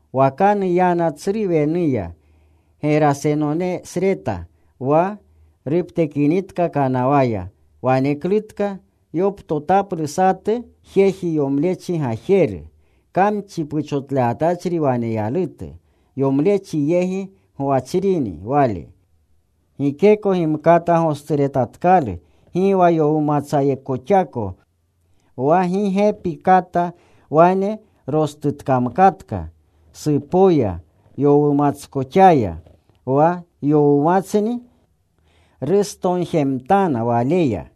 Wakanu yana tsru wenuya Gerasenonesreta. Wa ruptekinitka kanawaya, waneklutka yoptotaplu satu jeji yomlechi gajeru. Kamchi puchotlewatachri waneyalutu. Yomlechi yegi gwachrini wale. Gikeko gimkata gosturetatkalu, gi wa yowumatsayakoxapa. Wa gi gepi kata wane rostutkamkatka supoya yowumatskoxaya. Wa yowumatsni rustonjemtana waleya.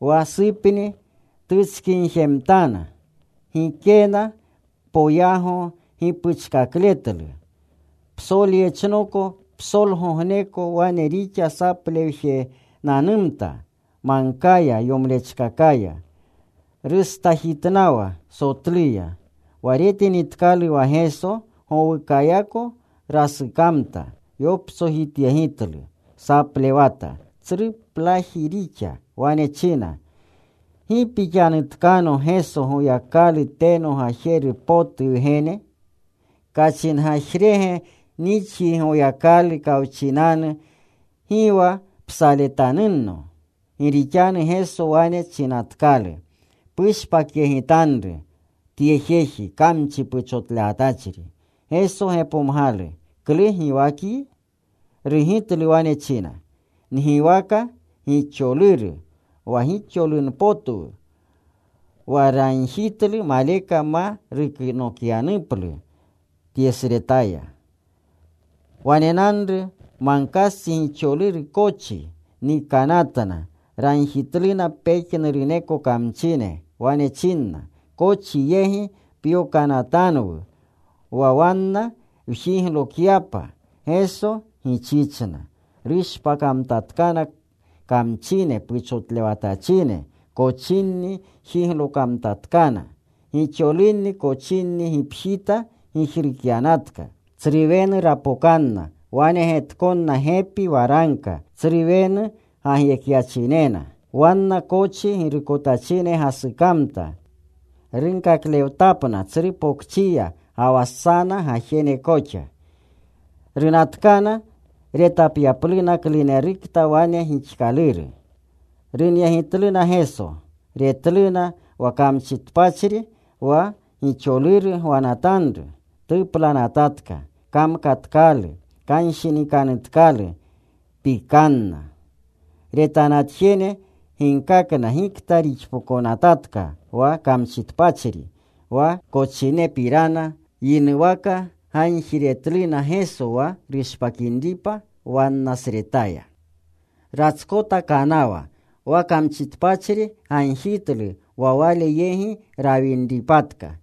Wa supni tutskinjemtana. Gikena poyago gipuchkakletlu. Psolyechnoko psolgogneko wane rixa saplewjenanumta magkaya yomlechkakaya. Rustajitnawa sotluya. Wa retinitkalu wa Geso gowukayako rasukamta. Yoptsojityegitlu. Saplewata. Tsruplaji rixa. Wane china, “¿Gi pixanutkano Geso, Goyakalu teno potu Gajeru Wgene? Kachingagjire nixyi Goyakalu kawchinanu, gi wa psaletpotutanno.” Gi rixanu Geso wane chinatkalu, “Pushpakyegitanru tye jeji, kamchi puchotlewatachri.” Geso gepomgalu, “¿Klu giwakyi?” Rugitlu. Wane china, “Ngiwaka Gixoluru, wa gixolurunpotwu.” Wa ragjitlu maleka ma yokanatyaplu tyesretaya. Wanenanru magkastsi gixoluru kochi. Nikanatna. Ragjitluna pejnuruneko kamchine. Wane chinna, “Kochi yegi pyokanatanunwu wa wanna wjiglokyapa.” Geso gichichna. Rushpakamtatkana kamchine puchotlewatachine. Kochinni jiglokamtatkana. Gixolunni kochinni gipjita gijrukyanatka. Tsru wenu rapokanna. Wanegetkonna gepi waragka. Tsru wenu gagyekyachinena. Wanna kochi girukotachine gasukamta. Runkaklewtapna tsru pokchiya, ga wa sana gajene koxa. Runatkana retapyapluna klunerukta wane gixkaluru. Runyegitluna Geso. Retluna wa kamchitpachri wa gixoluru gwanatanru. Tuplanatatka. Kamkatkalu. Kanshinikanutkalu. Pikanna. Retanatjene ginkakna gikta rixpokonatka wa kamchitpachri, wa kochinepirana. Yinuwaka gagjiretluna Geso wa rushpakinripa wannasretaya. Ratskota kanawa. Wa kamchitpachri gagjitlu wa Wale yegi rawinripatka.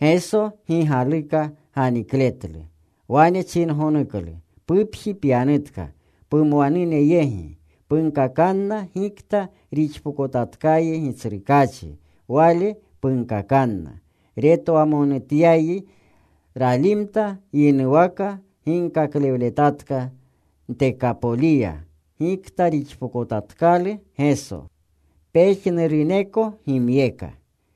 Geso gi galuka ganikletlu. Wane chingonuklu, “Pupji pyanutka pumwanune yegi. Punkakanna gikta rixpokotatkayi Gitsrukaachi. Wale punkakanna retwamonutyayi.” Ralimta. Yinuwaka ginkaklewletatka Ntekapoliya gikta rixpokotatkalu Geso. Pejnuruneko gimyeka.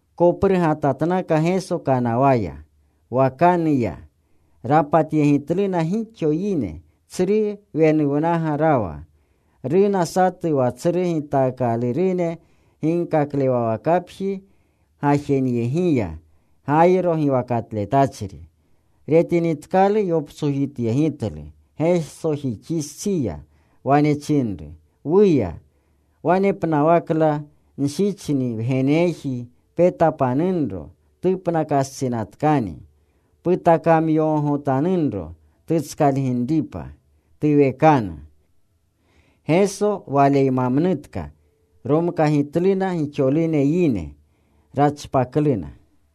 Koprugatatnaka Geso kanawaya. Wakanu ya. Rapatyegitluna gixo yine. Tsru wenuwnaga rawa. Runa satu wa tsru gitaakalurune ginkaklewawakapji gajenyegiya, Gayro giwakatletachri. Retinitkalu yoptsojityegitlu Gesojixistsiya. Wane chinru, “Wuya wanepnawakla nshicho wgeneji. Petapanunro. Tupnakastsinatkani. Putakamyogogotanunro tutskalginripa. Tuwekanu.” Geso waleymamnutka. Romkagimtluna gixolune yine. Rachpakluna.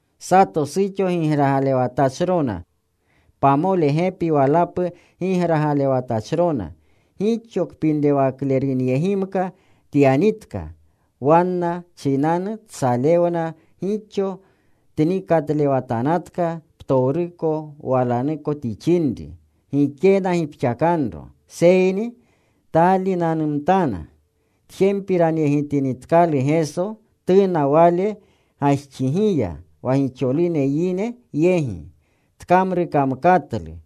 Sato suxo gigragalewatachrona. Pamole gepi walapu gigragalewatachrona. Gixo kpinrewaklerunyegimka tyanitka. Wanna chinanu tsalewna gixo. Tnikatlewatanatka ptowruko walanuko tixinri. Gikena gipxakanro. Seyni taalinanumtana. Tjempiranyegitinitkalu Geso, tuna Wale gajxigiya wa gixolune yine yegi. Tkamrukamkatlu.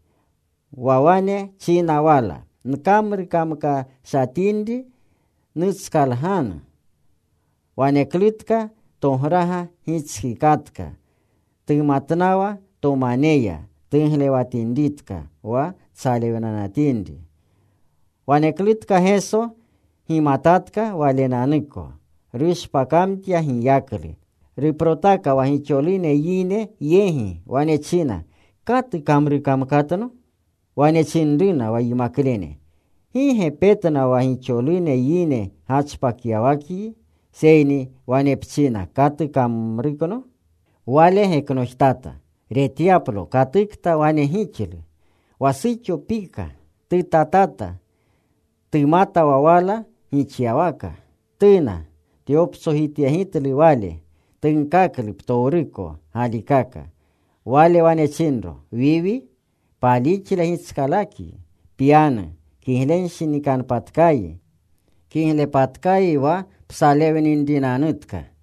Wa wane china wala, “Nkamrukamkashatinri nutskalganu.” Waneklutka tograga gitskikatka. Tumatnawa tomaneya tuglewatinritka wa tsalewnanatinri. Waneklutka Geso gimatatka Walenanuko rushpakamtyatka giyaklu. Ruprotaka wa gixolune yine yegi. Wane china, “¿Katu kamrukamkatno?” Wane chinruna wa yimaklene, “Gi ge petna wa gixolune yine gachpakyawakyi. Seyni wane pchina, ‘¿Katu kamrukno?’” Wale geknojtata retyaplo katukta wane gixlu. Wa suxo pika. Tutatata. Tumata wa wala gixyawaka. Tuna. Tyoptsojityegitlu Wale. Tunkaklu ptowruko galikaka. Wale wane chinro, “Wiwi, palixle gitskalakyi. Pyanu. Kiglenshinikanpatkayi. Kiglepatkayi wa psalewninrinanutka.”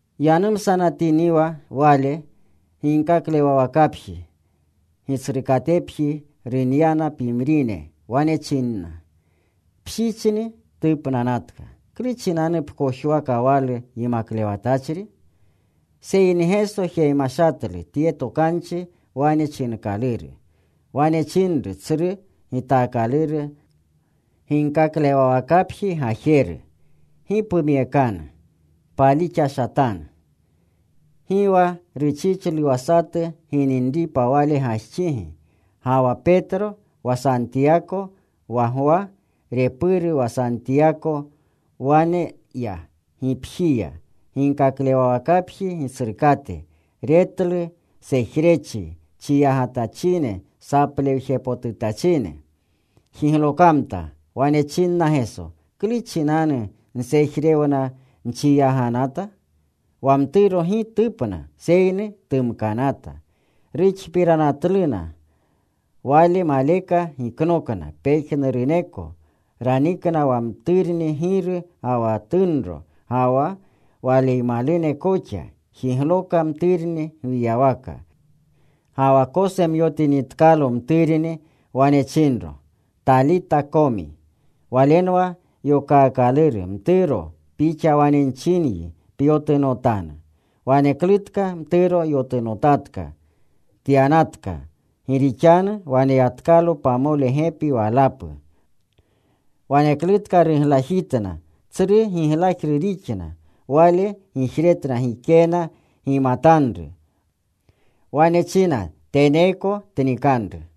Yanumsatiniwa Wale, ginkaklewawakapji gitsrukatepji runyana pimrine. Wane chinna, “Pshichni tupnanatka. ¿Klu chinanu pkojwakawalu Yimaklewatachri?” Seyni Geso jemashatlu tye tokanchi wane chinkaluru. Wane chinru tsru gitaakaluru ginkaklewawakapji gajeru, “Gi pumyekanu. Palixashatanu.” Gi wa ruchichlu wa satu gininripa Wale gajxigi ga wa Petro, wa Santiyako, wa Gwa, repuru wa Santiyako Wane ya gipjiya ginkaklewawakapji gitsrukate. Retlu sejrechi, chiyagatachine, saplewjepotutachine. Jiglokamta. Wane chinna Geso, “¿Klu chinanu nsejrewna nchiyaganata? Wa mturo gi tupna seyni tumkanata.” Ruxpiranatluna. Wale maleka giknokna pejnuruneko. Ranikna wa mturni giru ga wa tunro, ga wa Waleymalune koxa. Jigloka mturni gwiyawaka. Ga wa kosemyotinitkalo mturni, wane chinro, “Talita komi.” Walenwa yokaakaluru: “Mturo, pixa wane nchinyi, pyotunotanu.” Waneklutka mturo yotunotatka. Tyanatka, gi rixanu waneyatkalo pamole gepi walapu. Waneklutka ruglajitna. Tsru giglajru rixna. Wale gijretna gikena gimatanru. Wane china teneeko tnikanru.